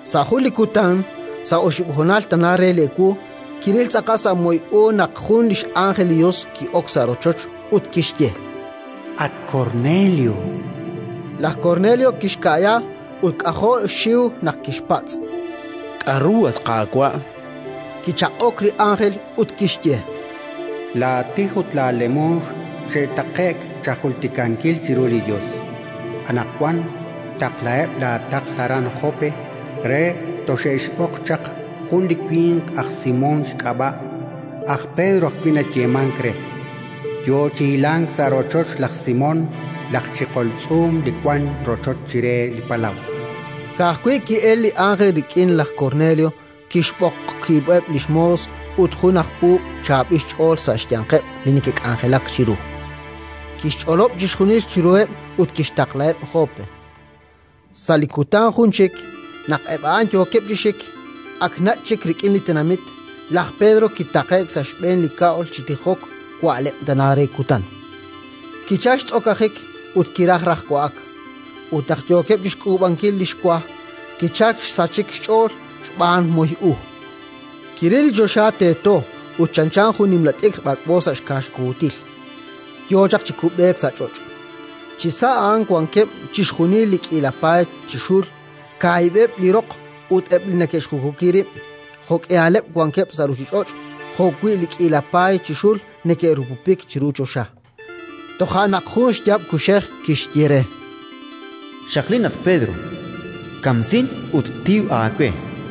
Sa' jun li kutan, sa' oxib' honal tana re ewu, kiril tz'aqal sa' moy u naq jun li x'ánjel li Yos ki'ok sa' rochoch ut kixye re: “At Kornelio!”. Laj Kornelio kixka'ya ut k'ajo' xxiw naq kixpatz': “K'aru, at Qaawa'?”, chan. Kichaq'ok li ánjel, ut kixye: “Laatij ut laalemoox xe'taqe'k chajultikankil chiru li Yos. Anaqwan taqlaheb' laataql aran Jope re toxe'xb'oq chaq jun li winq aj Simón xk'ab'a', aj Pedro ajwi' nayeemank re, yo chi hilank sa' rochoch laj Simón, laj chiqol tz'uum, li wank rochoch chire li palaw”. Ka'ajwi' ki'elk li ánjel rik'in, laj Kornelio kixb'oq wiib'eb' li xmoos ut jun aj puub' chaab'il xch'ool sa' xyanqeb' li neke'k'anjelak chiru, kixch'olob' chixjunil chiruheb' ut kixtaqlaheb' Jope. Sa' li kutan jun chik, naq eb' a'an yookeb' chi xik, ak nach' chik rik'in li tenamit, laj Pedro kitaqe'k sa' xb'een li kab'l chi tijok wa'leb' tana re li kutan. Kichalk xtz'okajik ut kiraj raj wa'ak. Ut naq yookeb' chi xk'uub'ankil li xwa, kichalk xsachik xch'ool xb'aan moy u. Kiril li choxa teeto ut chanchan jun nimla t'ikr b'ak'b'o sa' xkaaxukuutil, yo chaq chi kub'eek sa' ch'och'. Chisa' a'an wankeb' chixjunil li k'iila paay chi xul kaahib'eb' li roq ut eb' li neke'xjukuki rib', jo'k'ihaleb' wankeb' sa' ruuchich'och', jo'wi' li k'iila paay chi xul neke'rupupik chiru choxa. Toja' naq jun xyaab' kuxej kixye re: “Xaqlin, at Pedro; kamsin ut tiw aawe”.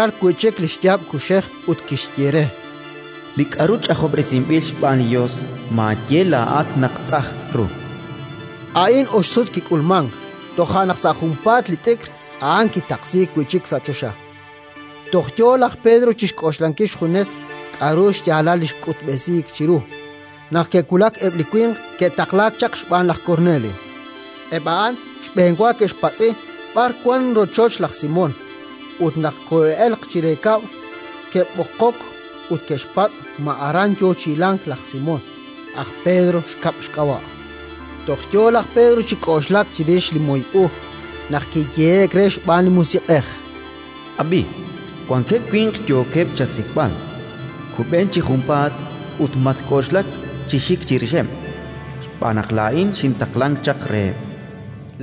Kichalk wi' chik li xyaab' kuxej ut kixye re: “Li k'aru ch'ajob'resinb'il xb'aan li Yos maaye laa'at naq tz'ajn ru”. A'in ox sut kik'ulmank; toja' naq sa' junpaat li t'ikr a'an kitaqsiik wi' chik sa' choxa. Toj yo laj Pedro chi xk'oxlankil xjunes k'aru xyaalal li xk'utb'esiik chiru, naq ke'wulak eb' li winq ke'taqlaak chaq xb'aan laj Kornelio. Eb' a'an xb'enwa ke'xpatz'i b'ar wank rochoch laj Simón ut, naq kole'elq chire kab'l, ke'b'oqok ut ke'xpatz' ma aran yo chi hilank laj Simón, aj Pedro xkab' xk'ab'a'. Toj yo laj Pedro chi k'oxlak chirix li moy u, naq kiyehe'k re xb'aan li Musiq'ej: “Ab'i, wankeb' winq yookeb' chasik'b'al. Kub'en chi junpaat ut matk'oxlak chi xik chirixeb', xb'aan naq laa'in xintaqlank chaq reheb'”.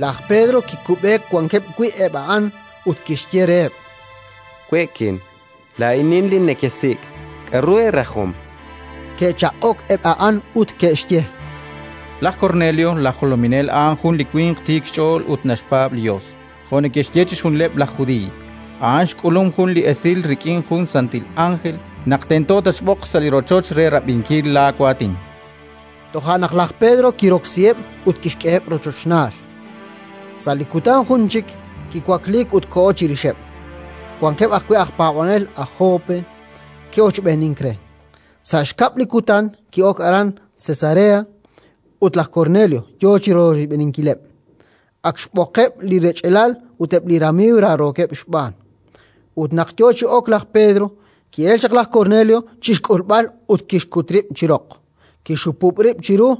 Laj Pedro kikub'eek wankeb' wi' eb' a'an ut kixye reheb': —We'kin. Laa'inin li nekesik'. K'aru eerajom? Ke'chaq'ok eb' a'an, ut ke'xye: —Laj Kornelio, laj jolominel, a'an jun li winq tiik xch'ool ut naxpaab' li Yos, jo' neke'xye chixjunileb' laj Judiiy. A'an xk'ulum jun li esil rik'in jun santil ánjel, naq tento tatxb'oq sa' li rochoch re rab'inkil laawaatin. Toja' naq laj Pedro kiroksiheb' ut kixk'eheb' rochochnaal. Sa' li kutan jun chik kiwakliik ut koho chirixeb'; wankeb' ajwi' aj paab'anel aj Jope ke'ochb'eenink re. Sa' xkab' li kutan ki'ok aran Cesarea ut laj Kornelio yo chi royb'eninkileb', ak xb'oqeb' li rech'alal ut eb' li ramiiw raarookeb' xb'aan. Ut naq yo chi ok laj Pedro, ki'elk chaq laj Kornelio chi xk'ulb'al ut kixkut rib' chi roq, kixhupub' rib' chiru.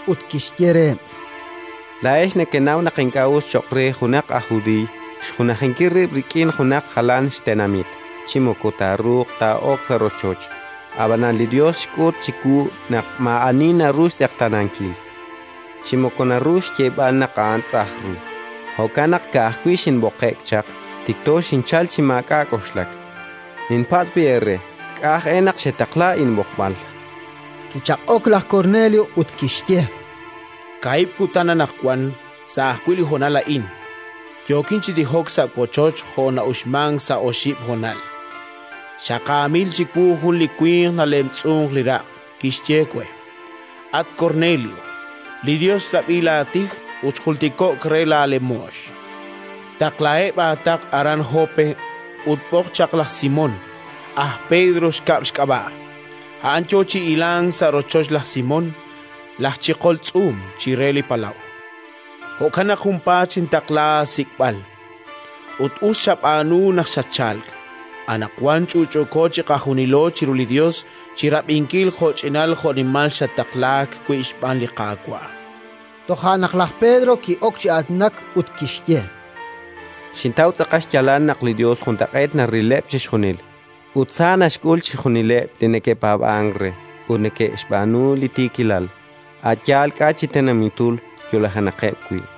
Ut kixye reheb': —Laa'ex nekenaw naq ink'a' us cho'q re junaq aj judiiy xjunajinkil rib' rik'in junaq jalan xtenamit chi moko taaruuq taa'ok sa' rochoch. Ab'anan li Yos xk'ut chiwu naq maa'ani naru xtz'eqtaanankil, chi moko naru xyeeb'al naq a'an tz'ajn ru. Jo'kan naq, ka'ajwi' xinb'oqe'k chaq, tikto xinchalk chi maak'a' k'oxlak. Ninpatz' b'i' eere k'a' aj e naq xetaqla inb'oqb'al. Kichaq'ok laj Kornelio, ut kixye: —Kohejer, sa' ajwi' li honal a'in, yookin chi tijok sa' wochoch jo' na'uxmank sa' oxib' honal, xaqaamil chiwu jun li winq nalemtz'unk li raq', kixye we: «At Kornelio, li Yos xrab'i laatij ut xjultiko'k re laalemoox. Taqlaheb' aataql aran Jope ut b'oq chaq laj Simón, aj Pedro xkab' xk'ab'a'; a'an yo chi hilank sa' rochoch laj Simón, laj chiqol tz'uum, chire li palaw». Jo'kan naq junpaat xintaqla aasik'b'al, ut us xab'aanu naq xatchalk. Anaqwan ch'utch'uuko chiqajunilo chiru li Yos chi rab'inkil jo'ch'inal jo'nimal xattaqlaak wi' xb'aan li Qaawa'. Toja' naq laj Pedro ki'ok chi aatinak ut kixye: —Xintaw tz'aqal xyaalal naq li Yos juntaq'eet narileb' chixjunil ut sa naxk'ul chixjunileb' li neke'paab'ank re ut neke'xb'aanu li tiikilal, a' yaal k'a' chi tenamitul yo'lajenaqeb' wi'.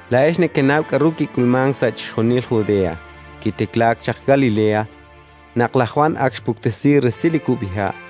Laa'ex nekenaw k'aru kik'ulmank sa' chixjunil Judea, kitiklaak chaq Galilea, naq laj Jwan ak xpuktesi resil li kub'iha';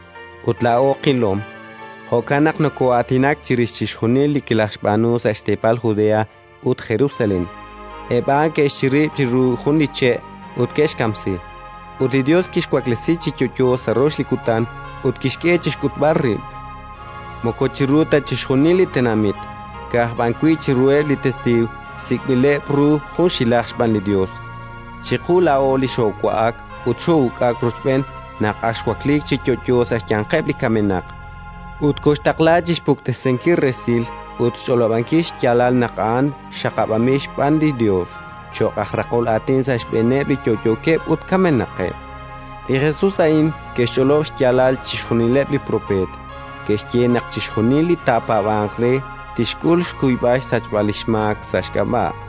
Ut laa'o qilom, jo'kan naq nokoo'aatinak chirix chixjunil li kilajxb'aanu sa' xteepal Judea ut Jerusalén. Eb' a'an ke'xchirib' chiru jun li che' ut ke'xkamsi; ut li Yos kixwaklesi chi yo'yo sa' rox li kutan ut kixk'e chi xk'utb'al rib', moko chiru ta chixjunil li tenamit, ka'aj b'an wi' chiruheb' li testiiw sik'b'ileb' ru junxilaj xb'aan li Yos, chiqu laa'o li xoowa'ak ut xoo'uk'ak rochb'een naq ak xwakliik chi yo'yo sa' xyanqeb' li kamenaq. Ut kooxtaqla chi xpuktesinkil resil ut xch'olob'ankil xyaalal naq a'an xaqab'anb'il xb'aan li Yos cho'q aj raqol aatin sa' xb'eeneb' li yo'yookeb' ut kamenaqeb'. Li Jesus a'in ke'xch'olob' xyaalal chixjunileb' li propeet: ke'xye naq chixjunil li taapaab'anq re tixk'ul xkuyb'al xsachb'al li xmaak sa' xk'ab'a'.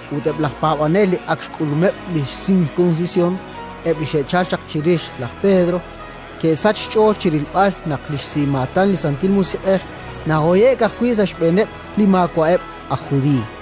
Ut eb' laj paab'anel li ak xk'ulumeb' li sirkunsisyon, eb' li xe'chalk chirix laj Pedro, ke'sachk xch'ool chi rilb'al naq li xsimaatan li Santil Musiq'ej nahoye'k ajwi' sa' xb'eeneb' li maawa'eb' aj Judiiy,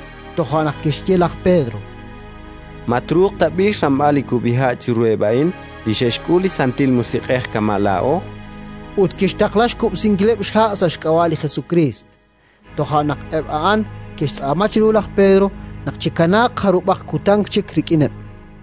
Toja' naq kixye laj Pedro: —Ma truuq tab'i' xramb'al li kub'iha' chiruheb' a'in li xe'xk'ul li Santil Musiq'ej kama' laa'o? Ut kixtaqla xkub'sinkileb' xha' sa' xk'ab'a' li Jesukriist. Toja' naq eb' a'an ke'xtz'aama chiru laj Pedro naq chikanaaq jarub'aq kutan chik rik'ineb'.